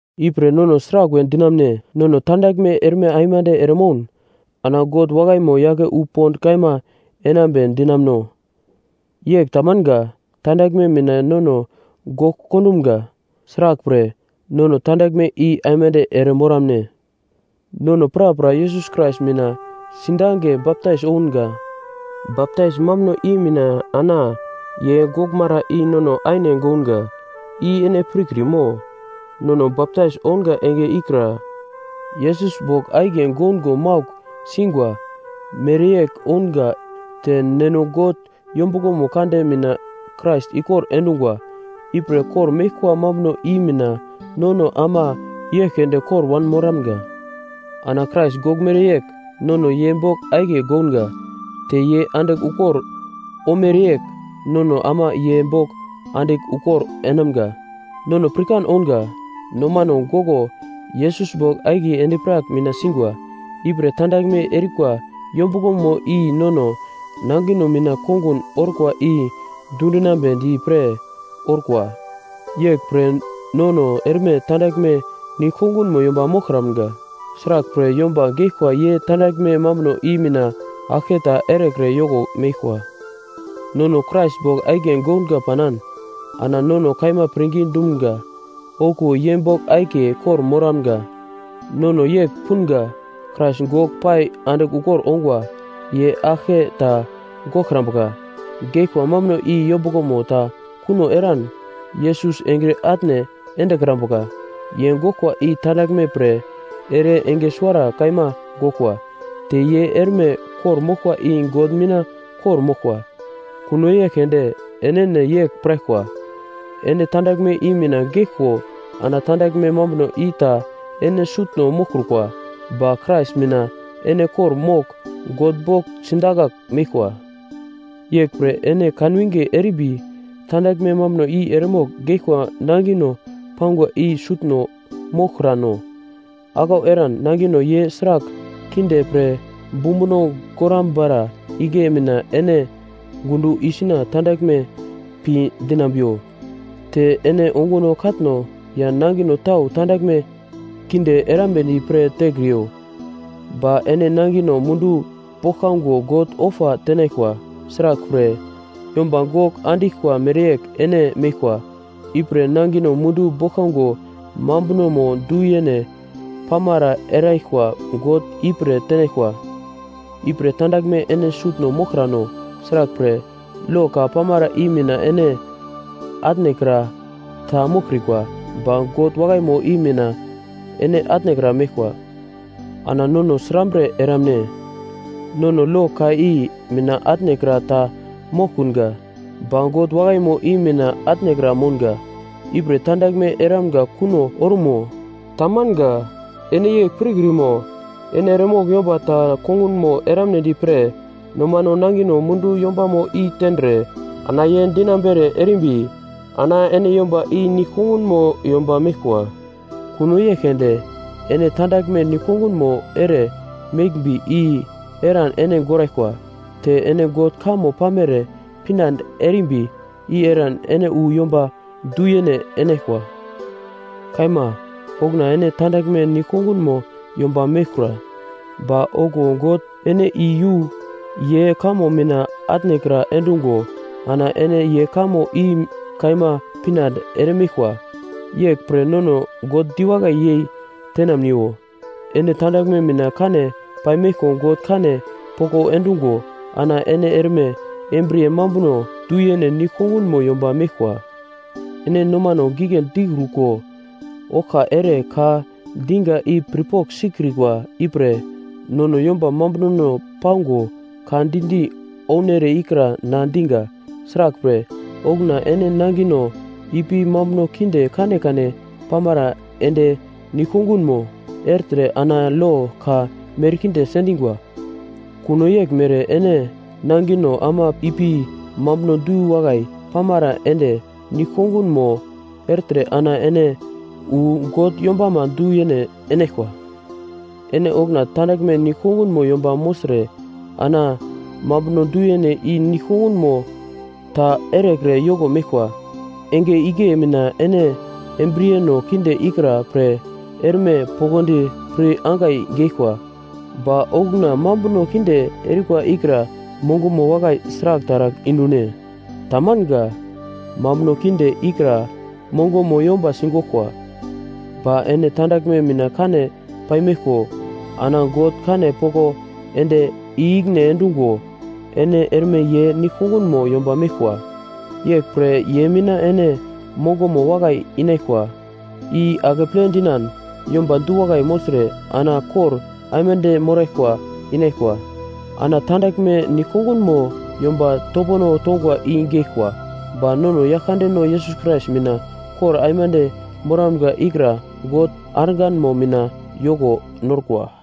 Ipre nono sraglwe dinamune? Nono tandaglme erme aimande eremoun ana God wakaimo yake wu pond kaima enambe dinamuno? Yegl tamanga. Tandaglme mina nono gogl kondumga; sraglpre nono tandaglme i aimande ere moramne? Nono prapra Yesus Krais mina sidange baptais ounga; baptais mambuno i mina ana ye goglmara i nono aine gounga, i ene pirkrimo? Nono baptais ounga enge ikra, Yesus bogl akiye goungo maugl singwa mereyegl ounga te Neno God yombuglomo kande mina Krais ikor endungwa ipre kor-meglkwa mambuno i mina nono ama yegl keunde kor wanmoramga. Ana Krais goglmere yegl nono ye bogl akiye gounga, te ye andigl ukor omereyegl nono ama ye bogl andigl ukor enamga. Nono pirkan ounga, nomano goglo Yesus bogl akiye endi-prak mina singwa. Ipre tandaglme erikwa yombuglomo i nono nangino mina kongun orkwa i dundinambedi pre orkwa. Yeglpre nono erme tandaglme nigl-kongunmo yomba moglkramga. Sraglpre, yomba geglkwa ye tandaglme mambuno i mina aglke ta erekre yoko meglkwa. Nono Krais bogl akiye gounga panan ana nono kaima pirngi dumga okuwo ye bogl akiye kor-moramga. Nono yegl punga: Krais gogl pai andigl ukor ongwa, ye aglke ta goglkrambuka. Geglkwa mambuno i yombuglomo ta kuno eran Yesus engre atne endekrambuka. Ye goglkwa i tandaglme pre ere enge suwara kaima goglkwa. Te ye erme kor-moglkwa i God mina kor-moglkwa. Kuno yegl keunde enene yegl piraglkwa, ene tandaglme i mina geglko ana tandaglme mambuno i ta ene sutno moglkrukwa, ba Krais mina ene kor-mogl God bogl sidakagl meglkwa. Yeglpre ene kanwinge erimbi tandaglme mambuno i eremogl geglkwa nangino pangwa i sutno moglkrano. Aglau eran nangino ye sragl kinde pre bumbuno gorambara igle mina ene gundo isuna tandaglme pi dinambiwo. Te ene onguno katno ya nangino tau tandaglme kinde erambedi pre tekriyo. Ba ene nangino mundu boglkango God ofa tenaglkwa. Sraglpre, yomba gogl andiglkwa mereyegl ene meglkwa, ipre nangino mundu boglkango mambunomo du-yene pamara eraglkwa God ipre tenaglkwa. Ipre tandaglme ene sutno moglkrano. Sraglpre, lo ka pamara i mina ene atnekra ta moglkrikwa, ba God wakaimo i mina ene atnekra meglkwa. Ana nono srambre eramne? Nono lo ka i mina atnekra ta moglkunga, ba God wakaimo i mina atnekra mounga. Ipre tandaglme eramga kuno orumo? Tamanga! Ene yegl pirkrimo? Ene eremogl yomba ta kongunmo eramnedi pre nomano nangino mundu yombamo i tendre ana ye dinambere erimbi, ana ene yomba i nigl-kongunmo yomba meglkwa. Kuno yegl keunde ene tandaglme nigl-kongunmo ere meglmbi i eran ene goraglkwa. Te ene God kamo pamere pinande erimbi, i eran ene wu yomba du-yene enaglkwa. Kaima, okuna ene tandaglme nigl-kongunmo yomba meglkura, ba okuwo God ene i yu ye kamo mina atnekra endungo ana ene ye kamo i kaima pinande eremeglkwa. Yeglpre nono God diwakai yei tenamniwo. Ene tandaglme mina kane paimeglko God kane poko endungo ana ene erme embriye mambuno du-yene nigl-kongunmo yomba meglkwa. Ene nomano gigle dikruko oglka ere ka diga i pirpogl sikrikwa ipre, nono yomba mambunono pango ka di-di ounere ikra na diga. Sraglpre, okuna ene nangino ipi mambuno kinde kanekane pamara ende nigl-kongunmo ertre ana lo ka merkinde sendingwa. Kuno yeglmere ene nangino ama ipi mambuno du-wakai pamere ende nigl-kongunmo ertre ana ene wu God yombama du-yene enaglkwa. Ene okuna tandaglme nigl-kongunmo yomba mogltre ana mambuno du-yene i nigl-kongunmo ta erekre yoko meglkwa. Enge igle mina ene embriyeno kinde ikra pre erme poglodi pir angai geglkwa, ba okuna mambuno kinde erikwa ikra mongomo wakai sragl taragl indu-ne? Tamanga. Mambuno kinde ikra mongomo yomba sigoglkwa. Ba ene tandaglme mina kane paimeglko ana God kane poko ende i-ikine endungo ene erme ye nigl-kongunmo yomba meglkwa. Yeglpre ye mina ene mongomo wakai inaglkwa i akeple dinan yomba du-wakai mogltre ana kor aimande moraglkwa inaglkwa. Ana tandaglme nigl-kongunmo yomba topono tongwa i geglkwa. Ba nono Yaglkandeno Yesus Krais mina kor aimande moramga ikra God arganmo mina yoko norkwa.